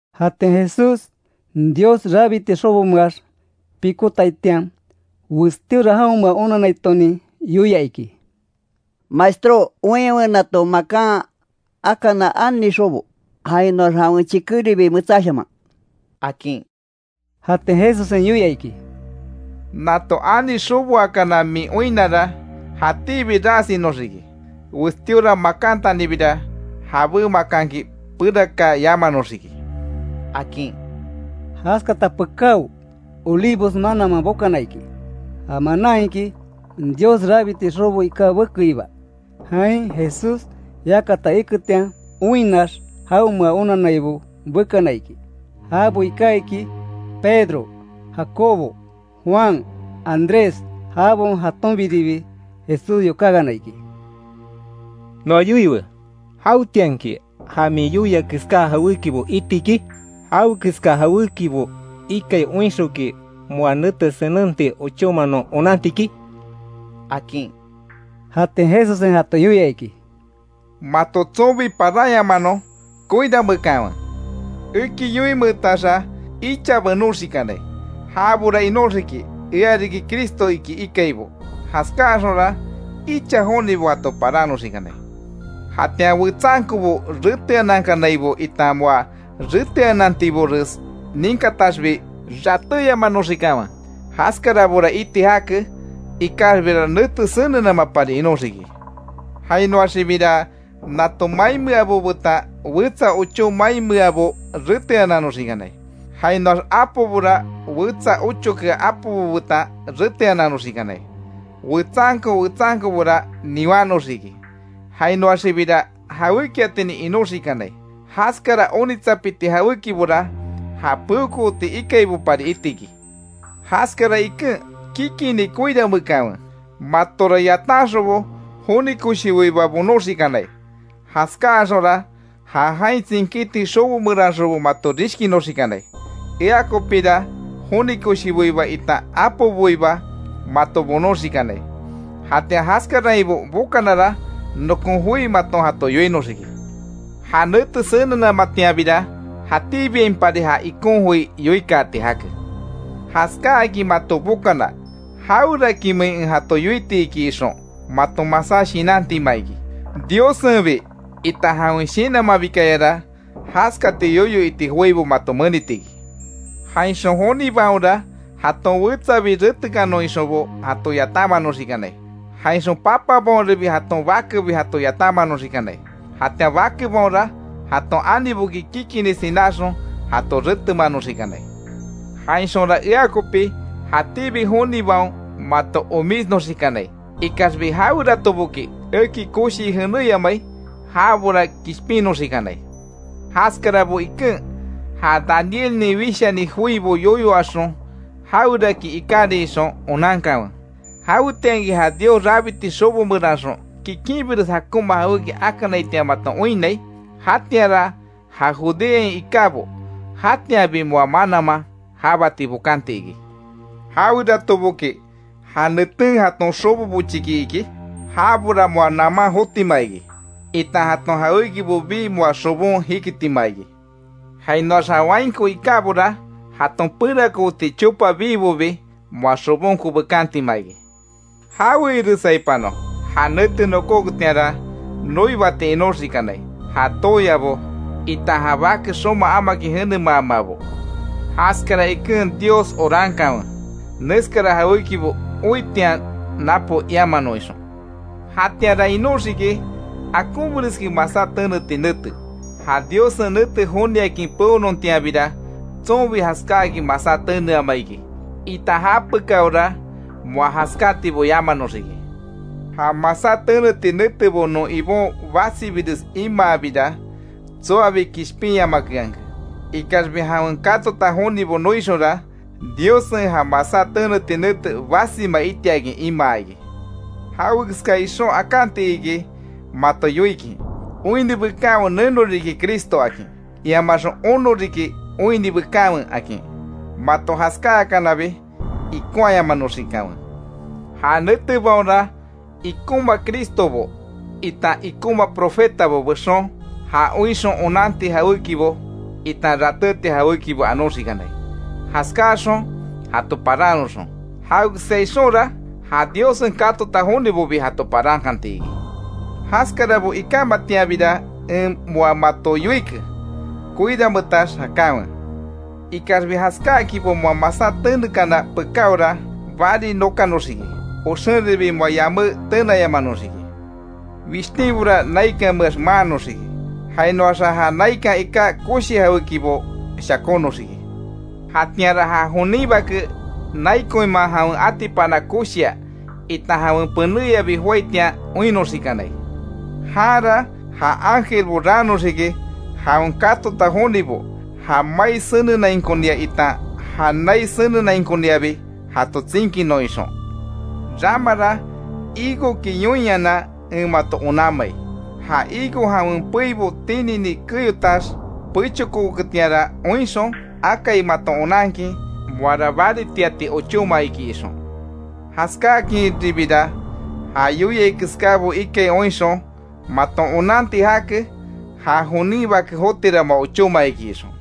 Jatian Jesús, Dios rabiti xobomeax pikotaitian, westíora jaonmea onanaitonin yoia iki: —Maestró, oinwe nato makan akana ani xobo, jainoax jawen chikéribi metsáshaman —akin. Jatian Jesussen yoia iki: —Nato ani xoboakana min oinnara, jatíbi ras inoxiki. Westíora makantanibira, jabé makanki perakaa yamanoxiki —akin. Jaskata pekáo, Olivos mananman bokana iki. Ja manan iki, Dios rabiti xobo iká bekeiba. Jain Jesús yakata iketian, oinnax jaonmea onannaibo bekana iki. Jabo iká iki; Pedro, Jacobo, Juan, Andrés. Jabaon jatonbiribi Jesús yokákana iki: —Noa yoiwe ¿Jawetianki, ja min yoia keská jawékibo iti iki? ¿Jawe keska jawékibo ikai oinxonki moa nete senenti ochóma non onanti iki? —akin. Jatian Jesussen jato yoia iki: —Mato tsonbi, paranyamanon koiranmeekanwe. Eki yoimeetaxa icha benóxikanai, jabora inoxiki: ‘Ea riki Cristo iki ikaibo. Jaskaáxonra, icha jonibo jato paranoxikanai’. Jatian wetsankobo reteanankanaibo, itan moa reteanantibores ninkataxbi, ratéyamanoxikanwe. Jaskarabora iti jake, ikaxbira, nete senenamapari inóxiki. Jainoaxibira, nato mainmeabo betan wetsa ochó mainmeabo reteananoxikanai. Jainoax apobora, wetsa ochokea apobo betan reteananoxikanai. Wetsanko, wetsankobora niwannoxiki Jainoaxibira jawékiatinin inoxikanai. Jaskara onitsapiti jawékibora, ja peokooti ikaibopari iti iki. Jaskara iken, kikini koirameekanwe. Matora yatanxonbo joni koshiboiba bonoxikanai. Jaskáxonra, ja jain tsinkíti xobo meranxonbo mato rishkinoxikanai. Ea kopira joni koshiboiba, itan apoboiba mato bonoxikanai. Jatian jaskarainbo bokanara, nokon joi maton jato yoinoxiki. Ja nete senenamatianbira, jatíbiainpari ja ikon joi yoikaati jake. Jaskáakin mato bokana, jawerakimein en jato yoiti iki ixon maton masá shinantima iki, Diossenbi, itan jawen Shinanmanbikayara, jaskati yoyo iti joibo mato menitiki. Jainxon jonibaonra, jaton wetsabi retekanon ixonbo jato yatanmanoxikanai. Jainxon papabaonribi jaton bakebi jato yatanmanoxikanai. Jatian bakebaonra, jaton aniboki kikini sináxon, jato retemanoxikanai. Jainxonra, ea kopi, jatíbi jonibaon mato omísnoxikanai. Ikaxbi jaweratoboki eki koshii jenéyamai, jabora kishpinnoxikanai. Jaskarabo iken, ja Danielnin wishani joibo yoyo axon jaweraki ikárin ixon, onankanwe; jawetianki ja Dios rabiti xobo meranxon, kikinbires jakonma jawéki akanaitian maton oinnai, jatianra ja Judeain ikábo, jatianbi moa mananman jábati bokanti iki. Jaweratoboki ja neten, jaton xobo bochiki iki, jabora moa naman jotima iki, itan jaton jawékibo bii moa xobon jikitima iki. Jainoax ja wainko ikábora, jaton perakooti chopa biibobi moa xobonko bekantima iki. ¡Jawe iresaipanon! Ja nete nokóketianra noibati inoxikanai, ja tooyabo, itan ja bake xoma amakin jenemamabo. Jaskara iken Dios orankanwe, neskara jawékibo oitian napo iamanon ixon. Jatianra inóxiki akonbireskin masá teneti nete, ja Diossen nete joniakin peonontianbira tsonbi jaskáakin masá teneama iki itan japekaora moa jaskátibo yamanoxiki. Ja masá teneti netebo non Ibon basibires imaabira, tsoabi kishpinyamakeanke. Ikaxbi jawen katota jonibo noixonra, Diossen ja masá teneti nete basima itiakin imaa iki. Jawekeska ixon, akanti iki mato yoikin: ‘Oinni bekanwe, neno riki Cristo, akin. Iamaxon, ono riki oinni bekanwe’, akin. Mato jaskáakanabi, ikonhayamanoxikanwe. Ja netebaonra, ikonma Cristobo itan ikonma profetabo bexon, ja oinxon onanti jawékibo itan rateti jawékibo anoxikanai; jaskáxon jato parannoxon. Jawekeska ixonra ja Diossen katota jonibobi, jato parankantiki. Jaskarabo ikámatianbira en moa mato yoike; koiranmeetax jakanwe. Ikaxbi jaskákinbo moa masá tenekana pekáora, bari nokanoxiki. Oxenribi moa yamé tenayamanoxiki. Wishtínbora naikanmeax, maannoxiki. Jainoaxa, ja naikan iká koshi jawékibo shakónoxiki. Jatianra ja jonin Bake, nai koinman jawen atipana koshia, itan jawen penéyabi joaitian oinnoxikanai. Janra ja ángelbo raannoxiki jawen katota jonibo, ja mai senenainkonia, itan ja nai senenainkoniabi jato tsinkinon ixon. Ramara higoki yoinhanan en mato onanmai. Ja higo jawen peibo tinini keyotax, pechokooketian oinxon, akai maton onankin, moara baritiati ochóma iki ixon. Jaskáakinribira, ja yoia keskábo ikai oinxon maton onanti jake, ja jonin Bake jotira moa ochóma iki ixon.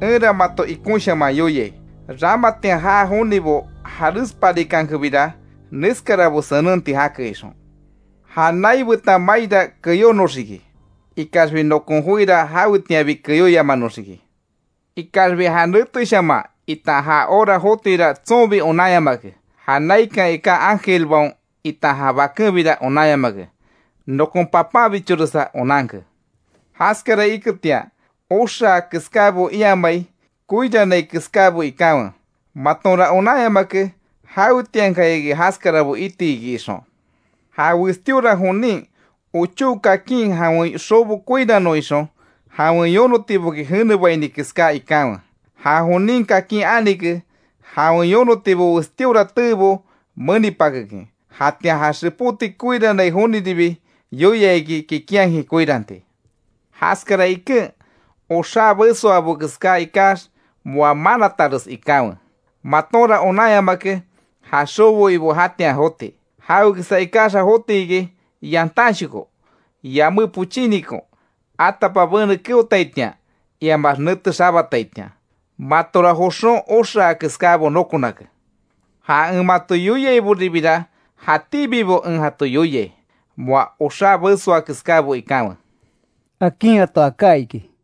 Enra mato ikonshaman yoiai, ramatian jaa jonibo jarésparikankebira, neskarabo senenti jake ixon. Ja nai betan maira keyónoxiki, ikaxbi nokon joira jawetianbi keyóyamanoxiki. Ikaxbi ja neteshaman, itan ja hora jotira tsonbi onanyamake. Ja naikan iká ángelbaon itan ja Bakenbira onanyamake. Nokon Papanbichoresa onanke. Jaskara iketian, oxaa keskábo iamai, koirannai keskábo ikanwe. Matonra onanyamake, jawetiankayaki jaskarabo iti iki ixon. Ja westíora jonin ochó kakin jawen xobo koiranon ixon jawen yonotiboki jenebaini keská ikanwe. Ja jonin kakin anike, jawen yonotibo westíora teebo menipakekin. Jatian ja xepóti koirannai joniribi yoia iki, kikinhakin koiranti. Jaskara iken, oxá besoabo keská ikax, moa manatares ikanwe. Matonra onanyamake ja xobo ibo jatian joti. Jawe keska ikaxa, joti iki, yantanshoko, yamé pochínikon, atapabene keotaitian, iamax nete xabataitian, matora joxon oxaa keskábo nokonake. Ja en mato yoiaiboribira, jatíbibo en jato yoiai: Moa oxá besoa keskábo ikanwe —akin jato aká iki.